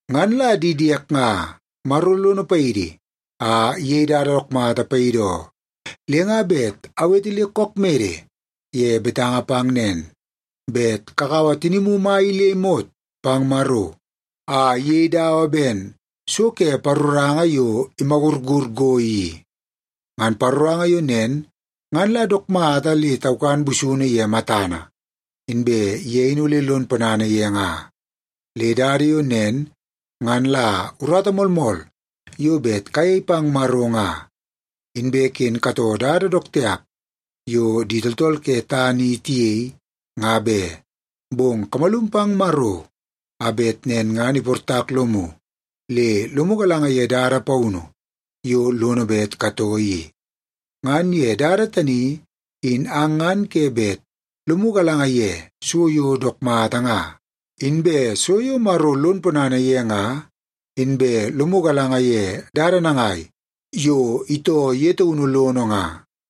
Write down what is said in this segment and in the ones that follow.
Ngan la di diek nga, Maro lono paidi a iyei dada dook mata paidi oo, le nga bet awete le kook mede ye betanga pang nen, bet kakaua tinimu mai in le imot pang Maro a iyei dawa ben so ke paroranga yo imagurur go i. Ngan paroranga yo nen ngan la dook mata le taukan busunu ye matana, inbe ye in ole lon ponana ye nga. Le dada yo nen ngan la urata moolmool yo bet kayei pang Maro nga. Inbe ken katoo dada dook tiap yo di tooltool ke tana i tiyei, nga be. Bong kamalum pang Maro a bet nen ngan iportak lomu le lomu galanga ye dada paunu yo lono bet katoo i. Ngan ye dada tani in ang ngan ke bet lomu galanga ye so yo dook mata nga, inbe so yo Maro lon ponana ye nga, inbe lomu galanga ye dada nangai yo itoo ye taunu lono nga.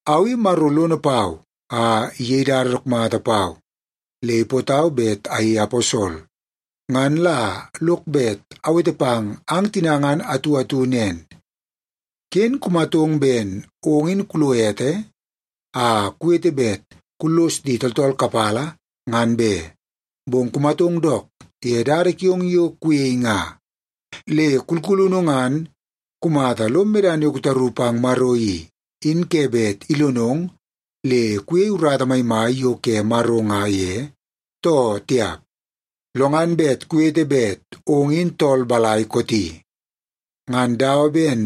Au i Maro lono pau a iyei dada dook mata pau, le ipootau bet ayei aposol. Ngan la lok bet awete pang ang tina ngan atu atu nen: Ken kumatong ben ong in kulo ete a kuwete bet kullos di tooltool kapala, ngan be, bong kumatong dook ye dada kiong yo kuyei nga. Le kulkulunu ngan kumata lom medana yo kutaru pang Maro i, in ke bet ilonong le kuyei urata maimai yo ke Maro nga ye, too tiap? Lo ngan bet kuwete bet ong in tool balai kooti. Ngan dawa ben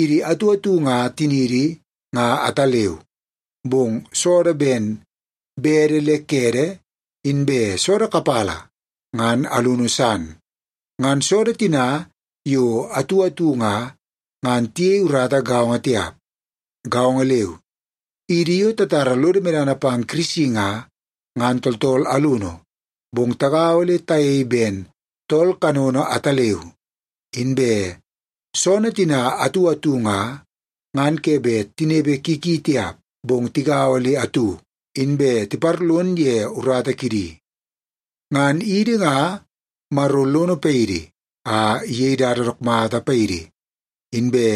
idi atu atu nga tiniidi nga ataleu, bong soodoo ben bede le kede inbe soodoo kapala ngan alunu san. Ngan soodoo tina yo atu atu nga, ngan tiyei urata gaongo tiap. Gaongo leu, idi yo tatara lodo medana pang Kirisi nga, ngan tooltool alunu, bong tagaua le tayei ben tool kanono ataleu. Inbe soonoo tina atu atu nga, ngan ke bet tinepe ki ki tiap, bong tigaua le atu, inbe tiparlon ye urata kidi. Ngan idi nga, Maro lono paidi a iyei dada dook mata paidi, inbe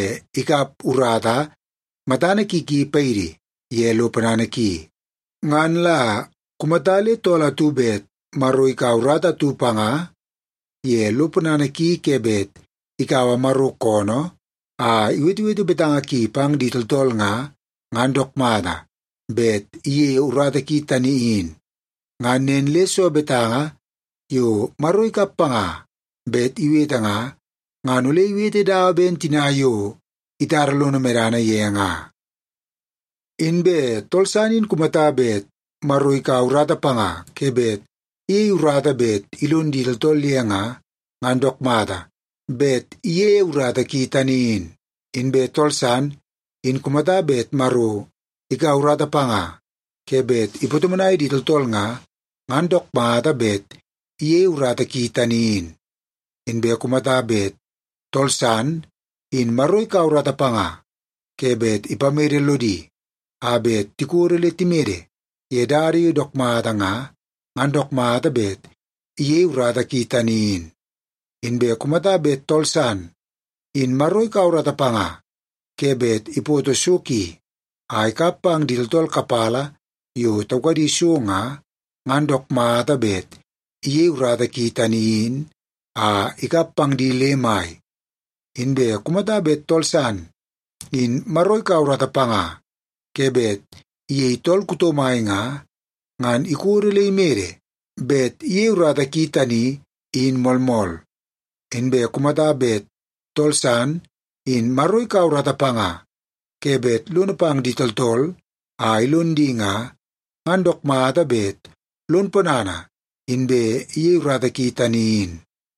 ikap urata matana ki ki paidi ye lo ponana ki. Ngan la kumata le tool atu bet Maro ikaua urata atu panga ye lo ponana ki ke bet ikaua Maro koonoo a iwetewete betanga ki pang di tooltool nga, ngan dook mata bet iyeie urata ki tani in. Ngan nen le soo betanga yo Maro ikap panga bet iwete nga, ngan ole iwete dawa ben tina yo itara lono medana ye nga. Inbe tool san in kumata bet Maro ikaua urata panga ke bet iyei urata bet ilon di tooltool ye nga, ngan dook mata bet iyeie urata ki tani in. Inbe tool san in kumata bet Maro ikaua urata panga ke bet ipatomonai di tooltool nga, ngan dook mata bet iyeie urata ki tani in. Inbe kumata bet tool san, in Maro ikaua urata panga ke bet ipamede lodi a bet tikodo le timede ye dada yo dook mata nga, ngan dook mata bet iyeie urata ki tani in. Inbe kumata bet tool san, in Maro ikaua urata panga ke bet ipoto so ki a ikap pang di tooltool kapala yo taukadi so nga, ngan dook mata bet iyeie urata ki tani in a ikap pang di le mai. Inbe kumata bet tool san, in Maro ikaua urata panga ke bet iyei tool kuto mai nga, ngan ikodo le imede bet iyeie urata ki tani in moolmool. Inbe kumata bet tool san, in Maro ikaua urata panga ke bet lono pang di tooltool a ilon di nga, ngan dook mata bet lon ponana inbe iyeie urata ki tani in.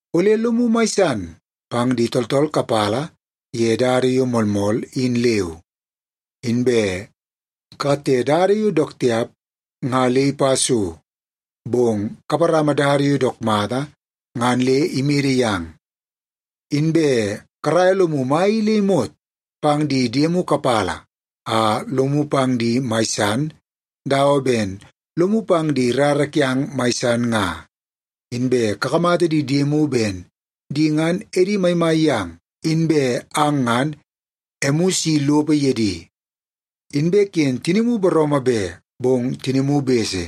Ole lomu mai san pang di tooltool kapala ye dada yo moolmool, in leu. Inbe kakatte dada yo dook tiap nga le ipa so, bong kaparama dada yo dook mata ngan le imede yang. Inbe karaia lomu mai i le imot pang di diemu kapala a lomu pang di mai san dawa ben lomu pang di rara kiang mai san nga. Inbe kakamata di diemu ben di ngan edi maimai yang, inbe ang ngan emu isi lopo ye di. Inbe ken tinimu booroomoo be, bong tinimu bese.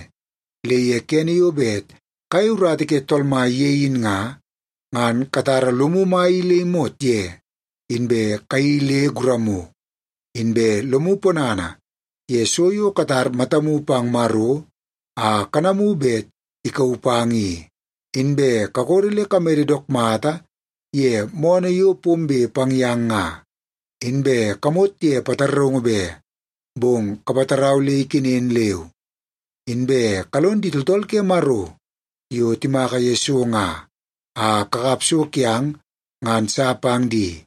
Le ye kene yo bet kayei urata ke Tool Mai ye in nga, ngan katara lomu mai i le imot ye inbe kayeii le guramu. Inbe lomu ponana ye so yo katar matamu pang Maro a kanamu bet ikauu pang i. Inbe kakodo le kamede dook mata ye moonoo yo pombe pang yang nga. Inbe kamot ye pataraungu be, bong kapatarau le ikenen leu. Inbe kalon di tooltool ke Maro yo timaka ye so nga, a kakap so kiang ngan sa pang di.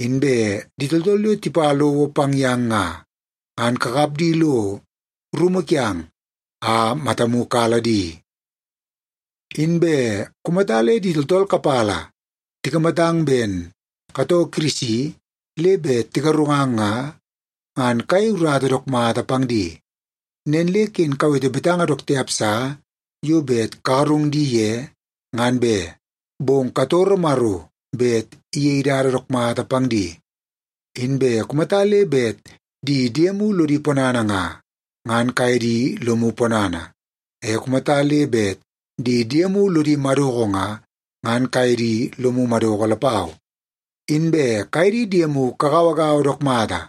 Inbe di tooltool yo tipa lowo pang yang nga, ngan kakap di lo rumu kiang a matamu kala di. Inbe kumata le di tooltool kapala tikamatang ben katoo Kirisi le bet tigarungang nga, ngan kayei urata dook mata pang di. Nen le ken kawete betanga dook tiap sa yo bet kagarung di ye, ngan be, bong katoro Maro bet iyei dada dook mata pang di. Inbe kumata le bet di diemu lodi ponana nga, ngan kaye di lomu ponana. E kumata le bet di diemu lodi madoko nga, ngan kaye di lomu madoko lapau. Inbe kaye di diemu kagauagaua dook mata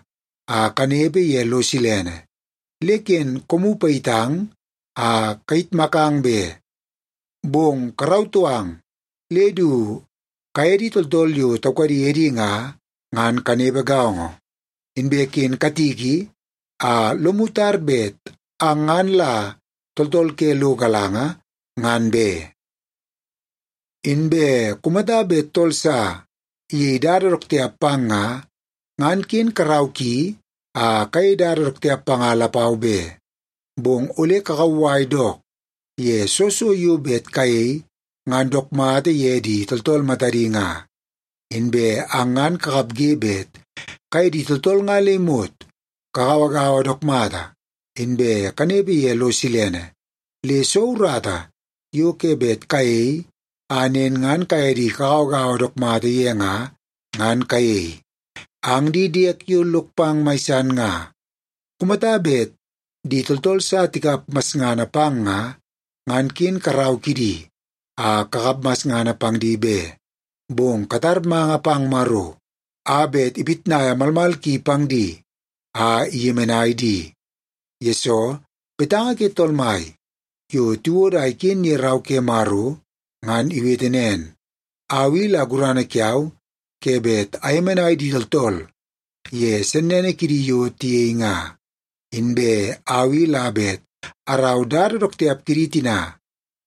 a kanepe ye lo silene. Le ken koomu payitang a kayitmakang be, bong karautoo ang le du kaye di tooltool yo taukadi edi nga, ngan kanepe gaongo. Inbe ken katiki a lomu tar bet ang ngan la tooltool ke lo galanga, ngan be. Inbe kumata bet tool sa iyei dada dook tiap pang nga, ngan ken karau ki a kayei dada dook tiap panga lapau be. Bong ole kakauwai dook ye soo so yo bet kayei ngan dook mata ye di tooltool matadi nga. Inbe ang ngan kakapge bet kaye di tooltool nga le imot kagauagaua dook mata, inbe kanepe ye lo silene. Le soo urata yo ke bet kayei a nen ngan kaye di kagauagaua dook mata ye nga, ngan kayei. Ang di diek yo lok pang mai san nga, kumata bet di tooltool sa tikap masngana pang nga, ngan ken karau kidi a kakap masngana pang di be. Bong katar manga pang Maro a bet ipitnaia malmal ki pang di a iyemenai di. Yesoo, betanga ke Tool Mai yo tiwodo a iken ye Rau ke Maro ngan iwete nen, “Au i la gurana kiau ke bet ayemenai di tooltool ye sennene kidi yo tiyei nga. Inbe au i la bet arau dada dook tiap kidi tina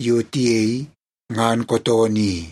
yo tiyei ngan kootoonoo i.”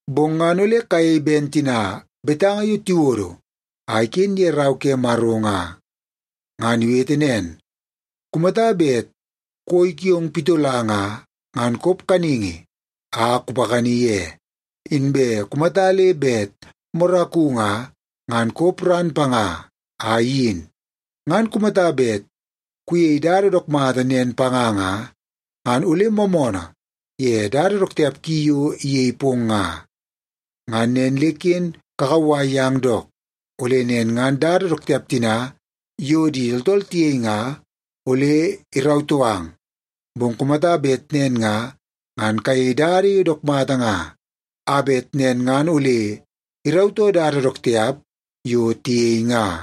Bong ngan ole kayei ben tina betanga yo tiwodo a iken ye Rau ke Maro nga. Ngan iwete nen, “Kumata bet koi kiong pitola nga, ngan kop kaningi a kupakani ye; inbe kumata le bet moraku nga, ngan kop ran panga a iyin. Ngan kumata bet kuyei dada dook mata nen panga nga, ngan ole moomoonoo ye dada dook tiap ki yo iyei pong nga.” Ngan nen le ken kakauwai yang dook, ole nen ngan dada dook tiap tina yo di tooltool tiyei nga ole irautoo ang. Bong kumata bet nen nga, ngan kayei dada yo dook mata nga, a bet nen ngan ole irautoo dada dook tiap yo tiyei nga.